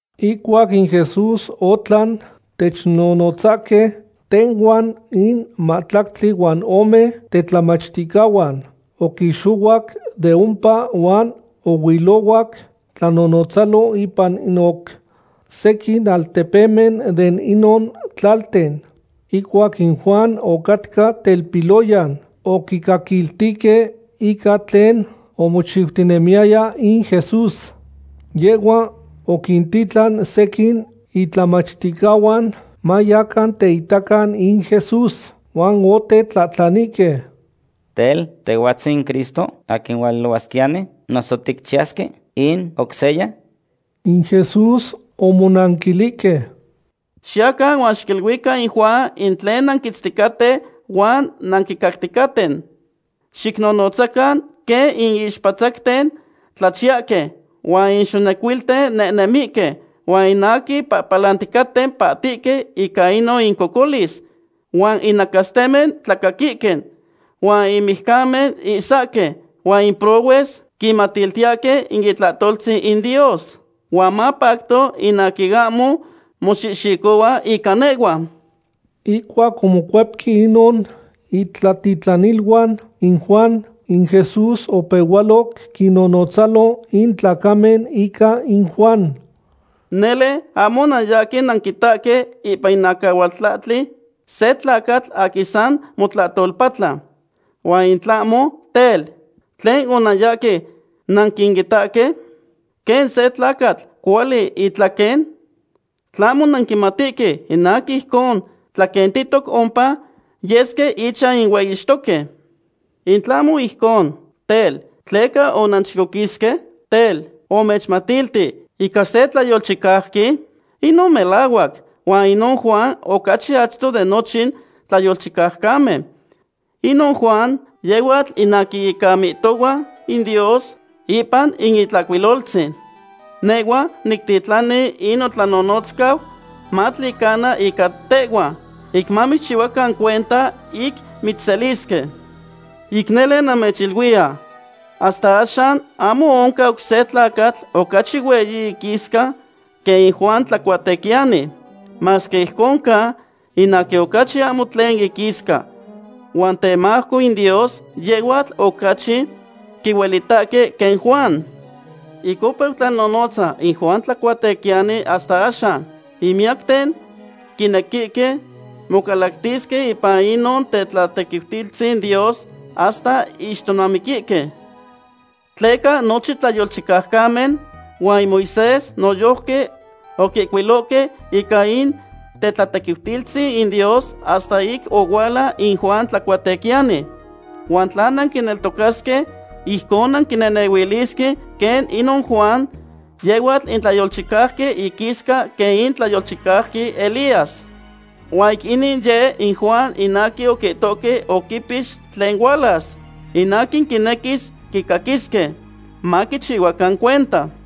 Ihcuac in Jesús otlan technonotzahque tehhuan in mahtlactli huan ome tetlamachticahuan, oquixohuac de ompa huan ohuilohuac tlanonotzalo ipan in oc sequin altepemen de inon tlalten. Ihcuac in Juan ocatca telpiloyan, oquicaquiltihque ica tlen omochiutinemiyaya in Jesús. Yehhua oquintitlan sequin itlamachticahuan mayacan teitacan in Jesús, huan otetlahtlanihque: ―Tel, ¿Tehhuatzin in Cristo, aquin hualuilohuasquiyani, noso ticchiyasque in oc seya? In Jesús omonanquilihque: ―Xiyacan huan xiquiluican in Juan in tlen nanquitzticaten huan nanquicacticaten. Xicnonotzacan quen in ixpatzacten tlachiyahque, huan in xonecuilten nehnemihque, huan in aquin pahpalanticaten pahtihque ica inon incocolis, huan in nacastemen tlacaquihque, huan in mijcamen ihsahque, huan in prohues quinmatiltiyahque in itlahtoltzin in Dios. Huan mapacto in aquin ahmo moxihxicohua ica nehhua. Ihcuac omocuepque inon itlatitlaniluan in Juan, in Jesús opehualoc quinnonotzalo in tlacamen ica in Juan: ―Nele ahmo onanyahque nanquitahque ipan in acahualtlahtli se tlacatl aquin san motlahtolpatla. Huan in tlahmo, tel, ¿tlen onanyahque nanquitahque? ¿Quen se tlacatl cuahcuali itlaquen? ¿Tlahmo nanquimatihque in aquin ijcon tlaquentihtoc ompa yesque ichan in hueyixtoque? In tlahmo ijcon, tel, ¿tleca onanchicoquisque? Tel, ¿omechmatilti ica se tlayolchicauqui? Inon melahuac, huan inon Juan ocachi achto de nochin tlayolchicaucamen. Inon Juan yehhuatl in aquin ica mihtohua in Dios ipan in Itlahcuiloltzin: Nehhua nictitlani in notlanonotzcau matlicana ica tehhua, ic mamitzchihuacan cuenta ic mitzselisque. Ic nele namechiluiya, hasta axan ahmo oncan oc se tlacatl ocachi hueyi iquisca quen in Juan Tlacuatequiyani. Masque ijcon ca, in aquin ocachi ahmo tlen iquisca huan temajco in Dios, yehhuatl ocachi quihuelitaque quen Juan. ’Ic opeu tlanonotza in Juan Tlacuatequiyani hasta axan, in miyacten quinequihque mocalactisque ipan inon tetlatequiutilistzin Dios hasta ixtomamiquihque. Tleca nochin tlayolchicaucamen huan in Moisés noyojqui oquihcuilohque ica in tetlatequiutilistzin in Dios hasta ic ohuala in Juan Tlacuatequiyani. Huan tla nanquineltocasque, ijcon nanquinehnehuilisque quen inon Juan, yehhuatl in tlayolchicauqui iquisca quen in tlayolchicauqui Elías. Huan ic inin yeh in Juan in aquin oquihtohque oquipix tlen hualas. In aquin quinequihque quicaquisque, maquichihuacan cuenta.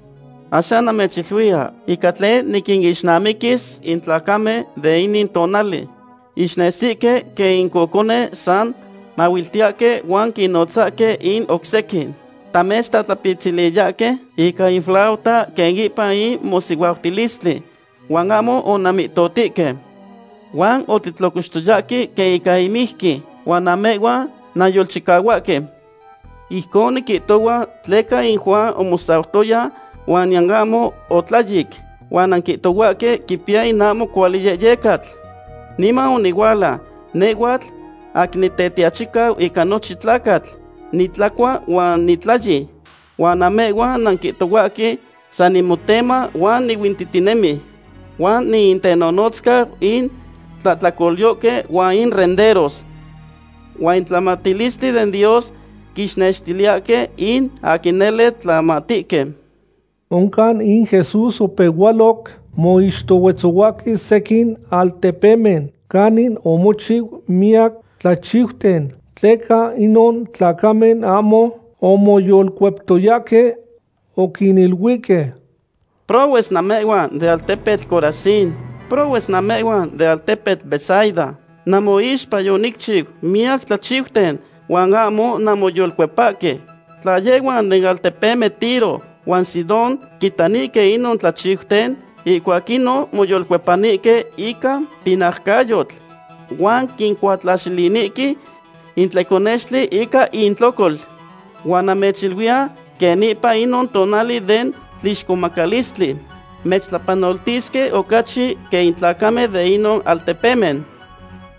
’Axan namechiluiya ica tlen niquinixnamiquis in tlacamen de inin tonali. Ixnesihque quen in cocone san mahuiltiyahque huan quinnotzahque in oc sequin: “Tamechtlatlapitziliyahque ica in flauta quen ipan in mosihuautilistli huan ahmo onanmihtohtihque. Huan otitlocoxtoyahque quen ica in mijqui huan namehhuan nanyolchicahuahque.” Ijcon niquihtohua tleca in Juan omosautoya huan niyan ahmo otlayic, huan nanquihtohuahque quipiya in ahmo cuali yehyecatl. Niman onihuala, nehhuatl aquin Nitetiachicau ica nochin tlacatl, nitlacua huan nitlayi, huan namehhuan nanquihtohuahque san nimotema huan nihuintihtinemi, huan niintenonotzcau in tlahtlacolyohque huan in renderos. Huan in tlamatilistli den Dios quinextiliyahque in aquin nele tlamatihque. Oncan in Jesús opehualoc moixtohuetzohuahque sequin altepemen canin omochiu miyac tlachiuten, tleca inon tlacamen ahmo omoyolcueptoyahque. Oquiniluihque: ―¡Prohues namehhuan den altepetl Corazín! ¡Prohues namehhuan den altepetl Betsaida! Namoixpa yonicchiu miyac tlachiuten huan ahmo nanmoyolcuepahque. Tla yehhuan den altepemen Tiro huan Sidón quitanihque inon tlachiuten, ihcuac inon moyolcuepanihque ica pinaucayotl, huan quincuatlaxilinihque in tleconextli ica intlocol. Huan namechiluiya quen ipan inon tonali den tlixcomacalistli mechtlapanoltisque ocachi quen in tlacamen den inon altepemen.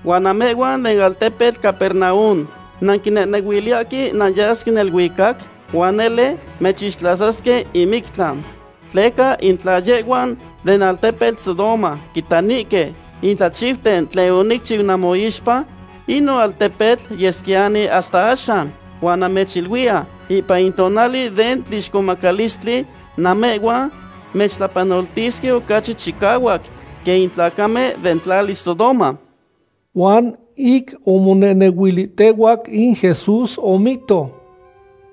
Huan namehhuan den altepetl Capernaum, ¿nanquinehnehuiliyahque nanyasque neluicac? Huan nele mechixtlasasque in mictlan. Tleca in tla yehhuan den altepetl Sodoma quitanihque in tlachiuten tlen onicchiu namoixpa, inon altepetl yesquiyani hasta axan. Huan namechiluiya ipan in tonali den tlixcomacalistli namehhuan mechtlapanoltisque ocachi chicahuac quen in tlacamen den tlali Sodoma. Huan ic omonehnehuilihtehuac, in Jesús omihto: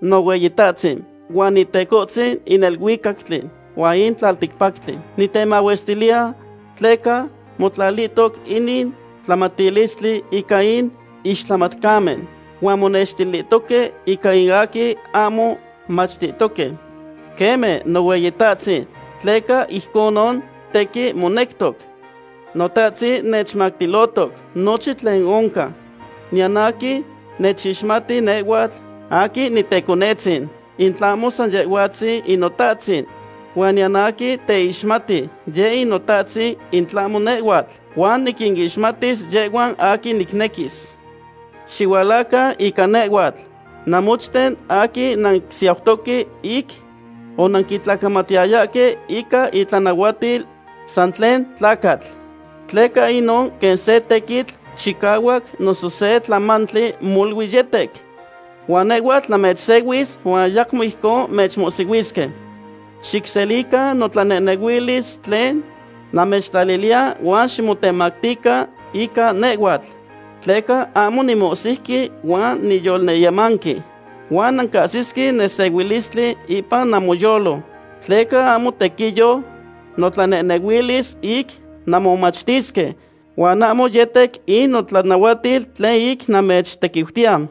―Nohueyitahtzin, huan Itecohtzin in neluicactli huan in tlalticpactli, nitemahuestiliya tleca motlatihtoc inin tlamatilistli ica in ixtlamatcamen, huan monextilihtoque ica in aquin ahmo machtihtoque. Queme, Nohueyitahtzin, tleca ijconon tequin monectoc. ’Notahtzin nechmactilohtoc nochin tlen oncan. Niyan aquin nechixmati nehhuatl aquin niteconetzin, in tlahmo san Yehhuatzin in Notahtzin. Huan niyan aquin teixmati yec in Notahtzin in tlahmo nehhuatl, huan niquinixmatiltis yehhuan aquin nicnequis. Xihualacan ica nehhuatl, namochten aquin nansiautoque ic onanquitlacamatiyayahque ica itlanahuatil san tlen tlacatl, tleca inon quen se tequitl chicahuac noso se tlamamali molui yetec. Huan nehhuatl namechsehuis huan ayacmo ijcon mechmohsihuisque. Xicselican notlanehnehuilis tlen namechtlaliliya huan ximotemactican ica nehhuatl, tleca ahmo nimohsiuqui huan niyolyemanqui; huan nancahsisque nesehuilistli ipan namoyolo. Tleca ahmo tequiyo notlanehnehuilis ic nanmomachtisque, huan ahmo yetec in notlanahuatil tlen ic namechtequiutiya.